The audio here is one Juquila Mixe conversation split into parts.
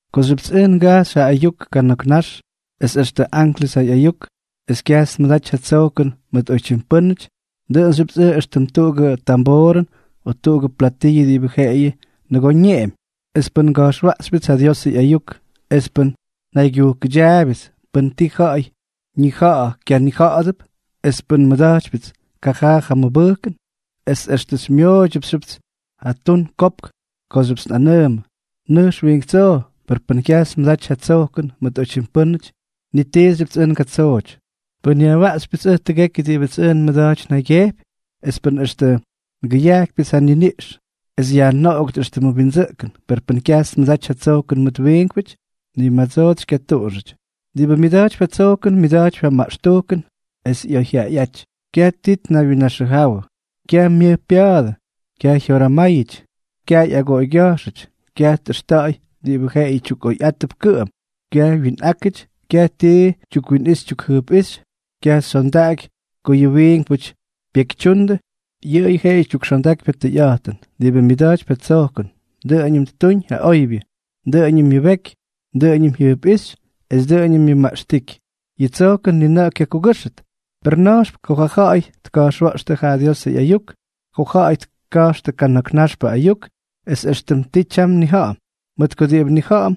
Kooxyʉpts ʉj ngajxy ja ayuk kana̱k nax, es extʉ anklʉs ja ꞌyayuk, es kyajts nmʉdaty ja tsojkʉn mʉt oytyim pʉ́nʉty, dʉꞌʉnxyʉpts ʉj éxtʉm tuꞌugʉ tamboorʉn o tuꞌugʉ platiyʉ diꞌibʉ jeꞌeyʉ nʉgoo ñeꞌemy. Es pʉn nga̱jxwaꞌxypyʉts ja Diosʉ ꞌyayuk, es pʉn njajaygyujkʉdyaabyʉts pʉn ti ja̱ꞌa̱y ñija̱ꞌa̱ kyanija̱ꞌa̱dʉp, es pʉn nmʉda̱jtypyʉts kajaa ja mʉbʉjkʉn, es extʉ xymyʉmʉdoobʉts ja tun kopk kooxyʉpts nꞌanʉʉmʉ: “Nʉjx wiink tsoo”, per pʉn kyajts nmʉdaty ja tsojkʉn mʉt oytyim pʉ́nʉty, ni tiixyʉpts ʉj ngatsooty. Pʉn nyajwaꞌxypyʉts ʉj tʉgekyʉ diꞌibʉts ʉj nmʉda̱jtypy njaygyejpy, es pʉn extʉ ngʉyajkypyʉts ja nniniꞌx es yajnoꞌogʉt éxtʉmʉ windsʉꞌkʉn, per pʉn kyajts nmʉdaty ja tsojkʉn mʉt ja wiinkpʉty, ni madsoots xykyatuꞌunxʉty. Diꞌibʉ myʉda̱jtypy ja tsojkʉn, myʉda̱jtypy ja maꞌxtujkʉn es oyjyaꞌayꞌáty, kyaj ti ñaywyinnaxʉjawʉ, kyaj myʉj pya̱a̱dʉ, kyaj jyoramáyʉty, kyaj ꞌyagoꞌoygya̱jxʉty, kyaj tꞌʉxta̱ꞌa̱y diꞌibʉ yʉꞌʉyʉ tyukꞌoyꞌátʉp kʉꞌʉm, kyaj wyinꞌákʉty, kyaj ti tyukwinꞌixy tyukjʉjpꞌíxy, kyaj xyondaꞌaky ko yʉ wiinkpʉty pyekytyundʉ, yʉꞌʉyʉ jeꞌeyʉ tyukxondakypy ja tʉyꞌa̱jtʉn. Diꞌibʉ myʉda̱jtypy ja tsojkʉn, dʉꞌʉñʉm ttuñ ja oybyʉ, dʉꞌʉñʉm myʉbeky, dʉꞌʉñʉm jyʉjpꞌíxy es dʉꞌʉñʉm myʉmaꞌxtíky. Yʉ tsojkʉn ni na̱ꞌa̱ kyakugʉ́xʉt; per na̱jxpʉꞌʉ ko ja̱ꞌa̱y tka̱jxwa̱ꞌxtʉ ja Diosʉ ꞌyayuk, ko ja̱ꞌa̱y tka̱jxtʉ kana̱k naxpʉ ayuk, es éxtʉm ti tyam nnija̱ꞌa̱m. Mʉt ko diꞌibʉ nnija̱ꞌa̱m,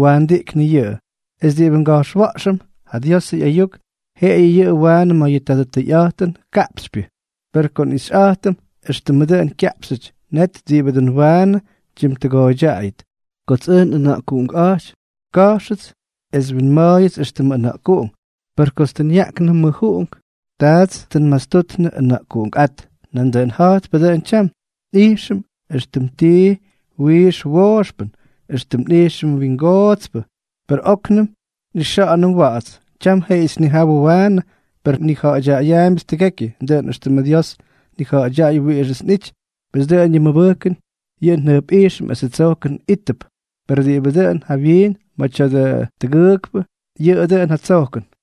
waandiꞌknʉ yʉꞌʉ; es diꞌibʉ nga̱jxwa̱ꞌxʉm ja Diosʉ ꞌyayuk, jeꞌeyʉ yʉꞌʉ waanʉ ma̱ yʉ tadʉ tʉyꞌa̱jtʉnʉ kaꞌpxypyʉ; per ko nꞌixyꞌa̱jtʉm éxtʉmʉ dʉꞌʉn kyaꞌpxyʉty, net diꞌibʉ dʉn waanʉ tyimtʉgooydyaꞌayʉt. Kots ʉj nꞌʉna̱ꞌkuꞌunkꞌa̱jty, ka̱jxʉts es winma̱a̱yʉts éxtʉmʉ ʉna̱ꞌkuꞌungʉn; per kots tʉ nyaꞌknʉ mʉjꞌuꞌunk, taats tʉ nmastutnʉ ʉna̱ꞌkuꞌunkꞌát. Nandʉꞌʉn ja̱jtpʉ dʉꞌʉn tyam, nꞌijxʉm éxtʉm tii wiix wooxpʉn, éxtʉmʉ ijxnʉ wingootspʉ, per óknʉm nꞌixa̱ꞌa̱nʉm wa̱ꞌa̱ts. Tyam jeꞌeyʉts nnijawʉ waanʉ, per nnija̱ꞌa̱dyaꞌayaambyʉts tʉgekyʉ, dʉꞌʉn éxtʉmʉ Dios tnija̱ꞌa̱dyaꞌay wiꞌixʉts nꞌity. Pes dʉꞌʉn yʉ mʉbʉjkʉn, yʉ jʉjpꞌijxʉn esʉ tsojkʉn ijttʉʉp; perʉ diꞌibʉ dʉꞌʉn jawyiin ma̱ tya̱dʉ tʉgʉʉkpʉ, yʉꞌʉ dʉꞌʉn ja tsojkʉn.